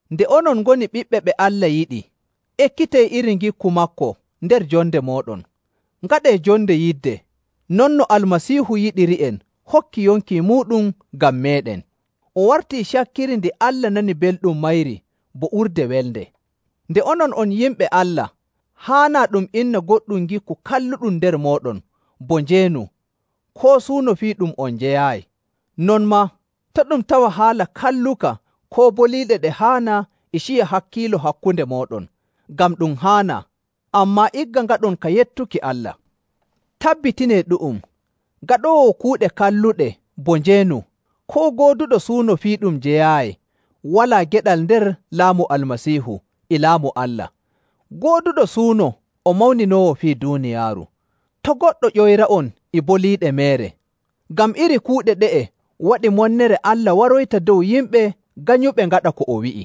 Nde onon ngoni ɓiɓɓe ɓe Allah yiɗi, ekkitee iri ngikku maako nder jonde mooɗon. Ngaɗee jonde yidde, non no Almasiihu yiɗiri'en hokki yonki muuɗum ngam meeɗen. O wartii cakkiri ndi Allah nani belɗum mayri bo urde welnde.. Nde onon on yimɓe Allah, haanaa ɗum inna goɗɗum ngikku kalluɗum nder mooɗon bo njeenu, koo suuno fii ɗum on njeyaayi. Non maa, to' ɗum tawa haala kalluka koo boliiɗe ɗe haanaa e ciya hakkiilo hakkunde mooɗon, ngam ɗum haanaa, ammaa igga ngaɗon ka yettuki Allah. Tabbitinee ɗu'um, gaɗoowo kuuɗe kalluɗe bo njeenu, koo gooduɗo suuno fii ɗum o jeyaayi walaa geɗal nder laamu Almasiihu e Laamu Allah. Gooduɗo suuno o mawninoowo fii duuniyaaru. To' goɗɗo ƴoyra'on e boliiɗe meere, ngam iri kuuɗe ɗe'e waɗii monnere Allah waroyta dow yimɓe ganyuɓe ngaɗa ko o wi'i.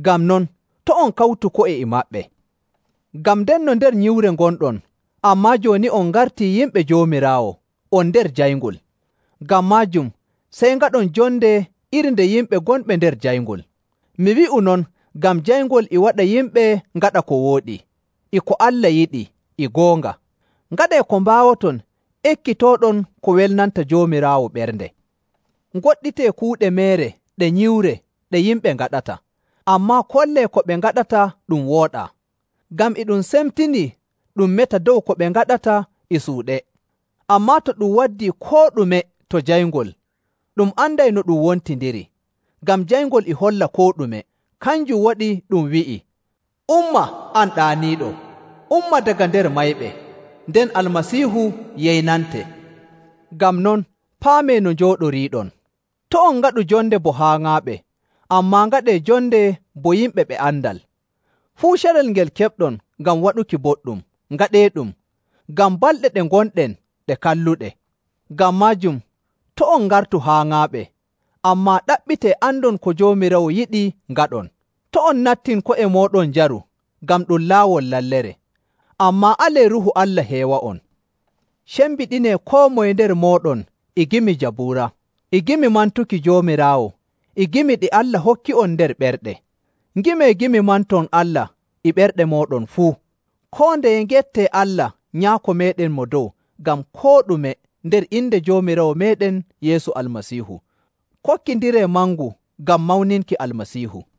Ngam non to' on kawtu ko'e e maɓɓe. Ngam ndenno nder nyiwre ngonɗon, ammaa jooni nde on ngartii yimɓe Joomiraawo, on nder jayngol. Ngam maajum sey ngaɗon jonde iri nde yimɓe gonɓe nder jayngol. Mi wi'u non ngam jayngol e waɗa yimɓe ngaɗa ko wooɗi, e ko Allah yiɗi, e goonga. Ngaɗee ko mbaawoton ekkitooɗon ko welnanta Joomiraawo ɓernde. Ngoɗɗitee kuuɗe meere ɗe nyiwre ɗe yimɓe ngaɗata, ammaa kollee ko ɓe ngaɗata ɗum wooɗaa. Ngam e ɗum semtinii ɗum meta dow ko ɓe ngaɗata e suuɗe. Ammaa to ɗum waddii koo ɗume to jayngol, ɗum anday no ɗum wontindiri, ngam jayngol e holla koo ɗume. Kanjum waɗi ɗum wi'i, “Umma, an ɗaaniiɗo, umma daga nder mayɓe, nden Almasiihu yeynante.” Ngam non paamee no njooɗoriiɗon. To' on ngaɗu jonde bo haaŋaaɓe, ammaa ngaɗee jonde bo yimɓe ɓe andal. Fuu carel ngel keɓɗon ngam waɗuki boɗɗum, ngaɗeeɗum, ngam balɗe ɗe ngonɗen ɗe kalluɗe.. Ngam maajum, to' on ngartu haaŋaaɓe, ammaa ɗaɓɓitee andon ko Joomiraawo yiɗi ngaɗon. To' on nattin ko'e mooɗon njaru, ngam ɗum laawol lallere. Ammaa alee Ruuhu Allah heewa'on. Cembiɗinee koo moye nder mooɗon e gimi Jabuura, e gimi mantuki Joomiraawo, e gimi ɗi Allah hokki'on nder ɓerɗe. Ngimee gimi manton Allah e ɓerɗe mooɗon fuu. Koo ndeye ngettee Allah Nyaako meeɗen Mo Dow ngam koo ɗume nder inde Joomiraawo meeɗen Yeesu Almasiihu.. Kokkindiree mangu ngam mawninki Almasiihu.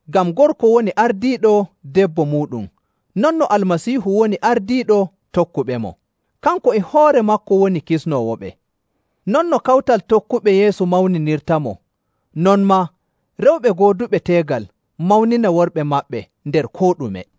Ngam gorko woni ardiiɗo debbo muuɗum non no Almasiihu woni ardiiɗo tokkuɓemo. Kanko e hoore maako woni kisnoowoɓe. Non no kawtal tokkuɓe Yeesu mawninirtamo, non maa rewɓe gooduɓe teegal mawnina worɓe maɓɓe nder koo ɗume.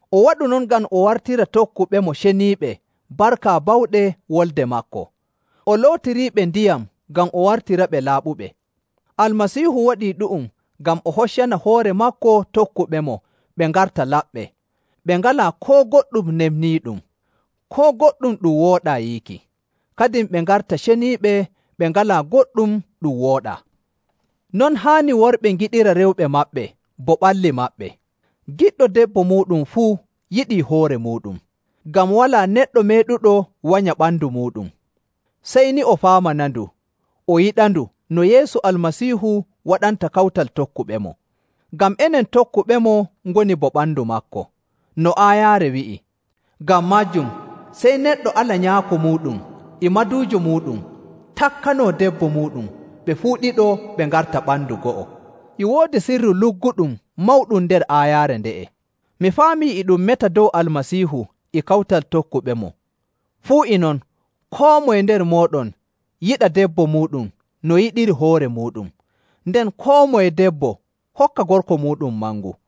O waɗu non ngam o wartira tokkuɓemo ceniiɓe barka bawɗe wolde maako, o lootiriiɓe ndiyam ngam o wartiraɓe laaɓuɓe. Almasiihu waɗii ɗu'um ngam o hoccana hoore maako tokkuɓemo ɓe ngarta laɓɓe, ɓe ngalaa koo goɗɗum nefniiɗum, koo goɗɗum ɗum wooɗaa yiiki. Kadin ɓe ngarta ceniiɓe ɓe ngalaa goɗɗum ɗum wooɗaa. Non haani worɓe ngiɗira rewɓe maɓɓe bo ɓalli maɓɓe. Giɗɗo debbo muuɗum fuu yiɗii hoore muuɗum. Ngam walaa neɗɗo meeɗuɗo wanya ɓandu muuɗum. Sey ni o faamanandu, o yiɗandu no Yeesu Almasiihu waɗanta kawtal tokkuɓemo. Ngam enen tokkuɓemo ngoni bo ɓandu maako. No aayaare wi'i, “Ngam maajum sey neɗɗo ala nyaako muuɗum e maduujo muuɗum takkanoo debbo muuɗum, ɓe fuu ɗiɗo ɓe ngarta ɓandu go'o.”. E woodi sirru lugguɗum mawɗum nder aayaare nde'e. Mi faamii e ɗum meta dow Almasiihu e kawtal tokkuɓemo. Fuu e non, koo moye nder mooɗon yiɗa debbo muuɗum no yiɗiri hoore muuɗum, nden koo moye debbo hokka gorko muuɗum mangu.